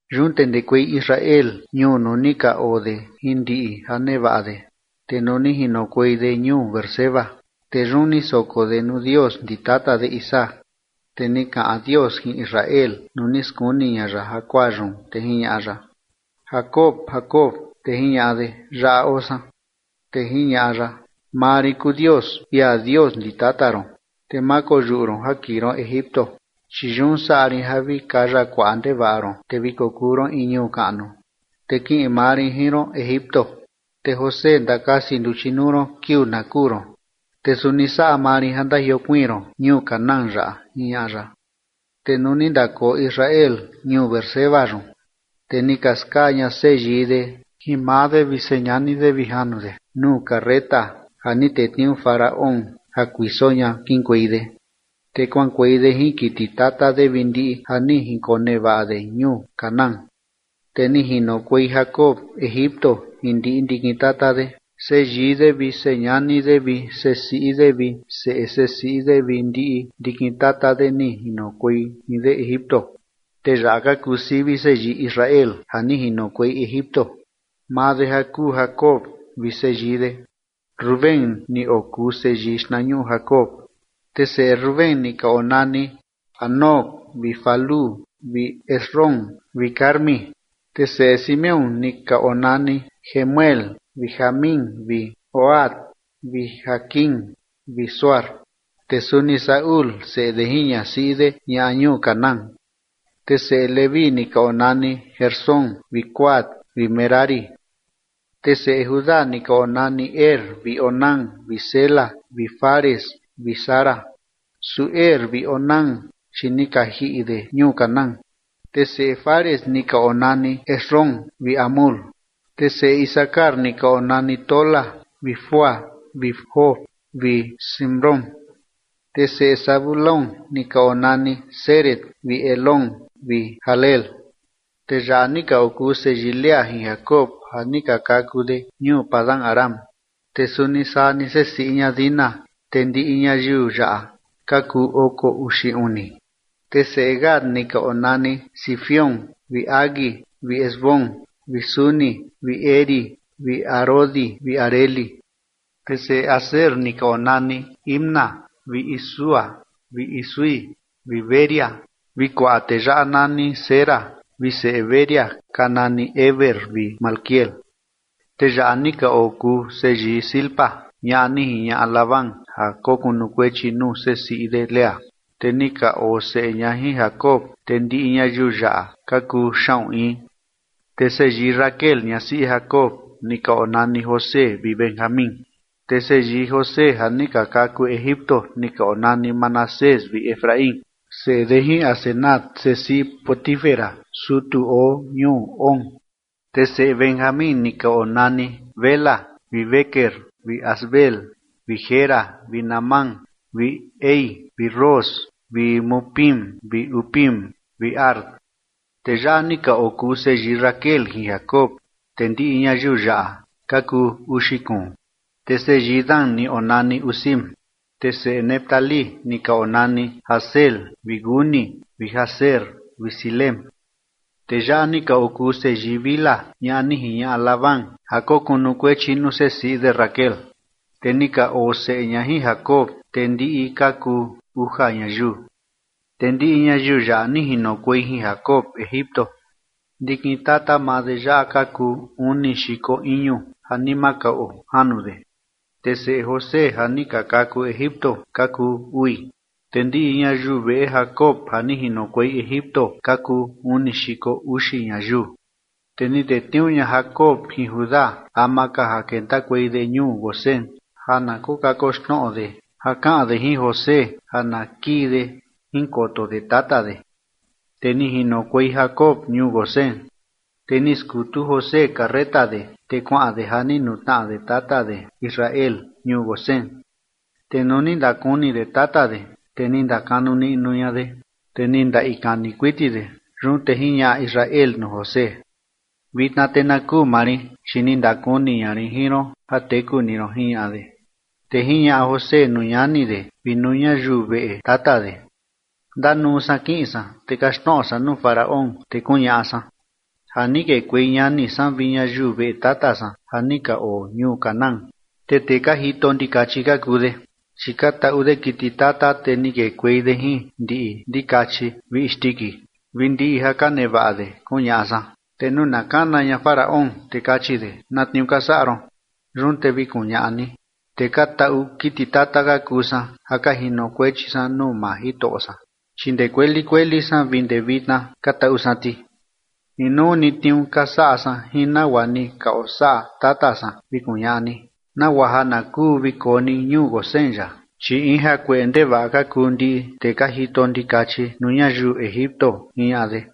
Yun te ndekuei Israel ñuu nuu ni ka oo de jin ndiꞌi ja nevaꞌa de, te nuu ni jinokuei de ñuu Beerseba, te yun ni soko de nuu Dios ndi tata de Isaac. Te ni kaꞌan Dios jin Israel nuu ni skuni ña ya jakuaa yun, te jiñaꞌa ya: ―Jacob, Jacob. Te jiñaꞌa de: ―Yaꞌa oo san. Te jiñaꞌa ya: ―Maa rin kuu Dios, ia Dios ndi tata ron, te ma koyuꞌu ron ja kiꞌin ron Egipto, chi yun saꞌa rin ja vi kaya kuaꞌa ndevaꞌa ron, te vi kokuu ron in ñuu kaꞌnu. Te kiꞌin maa rin jin ron Egipto, te José ndakasi nduchi nuu ron kiuu na kuu ron. Te suni saꞌa maa rin ja ndajiokuiin ron ñuu Canaán yaꞌa ―jiñaꞌa ya. Te nuu ni ndakoo Israel ñuu Beerseba yun, te ni ka skaa ña seyii de jin maa de vi señani de vi janu de nuu carreta ja ni tetniuu Faraón ja kuiso ña kiꞌinkuei de. Te kuaꞌankuei de jin kiti tata de vi ndiꞌi ja ni jinkonevaꞌa de ñuu Canaán, te ni jinokuei Jacob Egipto jin ndiꞌi ndikin tata de, seyii de vi señani de vi sesiꞌi de vi seꞌe sesiꞌi de vi ndiꞌi ndikin tata de ni jinokuei jin de Egipto. Te yaꞌa ka kuu sivi seyii Israel ja ni jinokuei Egipto, maa de ja kuu Jacob, vi seyii de. Rubén ni okuu seyii xtnañuꞌu Jacob. Te seꞌe Rubén ni ka onani Hanoc vi Falú vi Hezrón vi Carmi. Te seꞌe Simeón ni ka onani Jemuel vi Jamín vi Ohad vi Jaquín vi Zohar, te suni Saúl seꞌe de jin ñasiꞌi de ñaꞌa ñuu Canaán. Te seꞌe Leví ni ka onani Gersón vi Coat vi Merari. Te seꞌe Judá ni ka onani Er vi Onán vi Sela vi Fares vi Zara. Su Er vi Onán, chi ni ka jiꞌi de ñuu Canaán. Te seꞌe Fares ni ka onani Hezrón vi Hamul. Te seꞌe Isacar ni ka onani Tola vi Fúa vi Job vi Simrón. Te seꞌe Zabulón ni ka onani Sered vi Elón vi Jahleel. Tee yaꞌa ni ka okuu seyii Lea jin Jacob ja ni ka kaku de ñuu Padan-aram, te suni saa ni sesiꞌi ña Dina. Te ndiꞌi ñayiu yaꞌa ka kuu oko uxi uni. Te seꞌe Gad ni ka onani Zifión vi Hagui vi Ezbón vi Suni vi Eri vi Arodi vi Areli. Te seꞌe Aser ni ka onani Imna vi Isúa vi Isúi vi Bería, vi kuaꞌa tee yaꞌa nani Sera. Te seꞌe Bería ka nani Heber vi Malquiel. Tee yaꞌa ni ka okuu seyii Zilpa, ñaꞌa ni jiñaꞌa Labán ja kokunukuechi nuu sesiꞌi de Lea, te ni ka oo seꞌe ña jin Jacob. Te ndiꞌi ñayiu yaꞌa ka kuu xaꞌun in. Te seyii Raquel ñasiꞌi Jacob ni ka onani José vi Benjamín. Te seyii José ja ni ka kaku Egipto ni ka onani Manasés vi Efraín, seꞌe de jin Asenat sesiꞌi Potifera sutu oo ñuu On. Te seꞌe Benjamín ni ka onani Bela vi Bequer vi Asbel vi Gera vi Naamán vi Ehi vi Ros vi Mupim vi Hupim vi Ard. Tee yaꞌa ni ka okuu seyii Raquel jin Jacob. Te ndiꞌi ñayiu yaꞌa ka kuu uxi kuun. Te seyii Dan ni onani Husim. Te seꞌe Neftalí ni ka onani Jahzeel vi Guni vi Jezer vi Silem. Tee yaꞌa ni ka okuu seyii Bilha ñaꞌa ni jiñaꞌa Labán ja kokunukuechi nuu sesiꞌi de Raquel. Te ni ka oo seꞌe ña jin Jacob. Te ndiꞌi ka kuu uja ñayiu. Te ndiꞌi ñayiu yaꞌa ni jinokuei jin Jacob Egipto. Ndikin tata maa de yaꞌa ka kuu uni xiko iñu ja ni ma kaꞌuo janu de. Te seꞌe José ja ni ka kaku Egipto ka kuu ui, te ndiꞌi ñayiu veꞌe Jacob ja ni jinokuei Egipto ka kuu uni xiko uxi ñayiu. Te ni tetniuu ña Jacob jin Judá ama ka ja kentakuei de ñuu Gosén ja na kokakoxnoꞌo de ja kaꞌan de jin José ja na kiꞌin de jinkoto de tata de. Te ni jinokuei Jacob ñuu Gosén. Te ni skutu José carreta de, te kuaꞌan de ja ni nutnaꞌa de tata de Israel ñuu Gosén. Te nuu ni ndakuni de tata de, te ni ndakanu niꞌnu ña de, te ni ndaꞌi kani kuiti de. Yun te jiñaꞌa Israel nuu José: ―Vitna te na kuu maa rin, chi ni ndakuni ña rin jin ron ja teku ni ron ―jiñaꞌa de. Te jiñaꞌa José nuu ñani de vi nuu ñayiu veꞌe tata de: ―Ndanuu san kiꞌin san, te kaxtnoꞌo san nuu Faraón, te kuñaꞌa san: “Ja ni kekuei ñani san vi ñayiu veꞌe tata san, ja ni ka oo ñuu Canaán. Te tee ka jito ndikachi ka kuu de, chi ka taꞌu de kiti tata, te ni kekuei de jin ndiꞌi ndikachi vi isndiki, vi ndiꞌi ja ka nevaꞌa de”, kuñaꞌa san. Te nuu na kana ña Faraón, te kachi de: “¿Na tniuu ka saꞌa ron?” Yun te vi kuñaꞌa ni: “Tee ka taꞌu kiti tata ka kuu san ja ka jinokuechi san nuu maa jitoꞌo san, chi ndee kueli kueli san vi ndee vitna ka taꞌu san ti. Inuu ni tniuu ka saꞌa san jin nagua ni ka osaꞌa tata san”, vi kuñaꞌa ni, nagua ja na kuu vi koo ni ñuu Gosén yaꞌa, chi in jakueꞌe ndevaꞌa ka kuu ndiꞌi tee ka jito ndikachi nuu ñayiu Egipto ―jiñaꞌa de.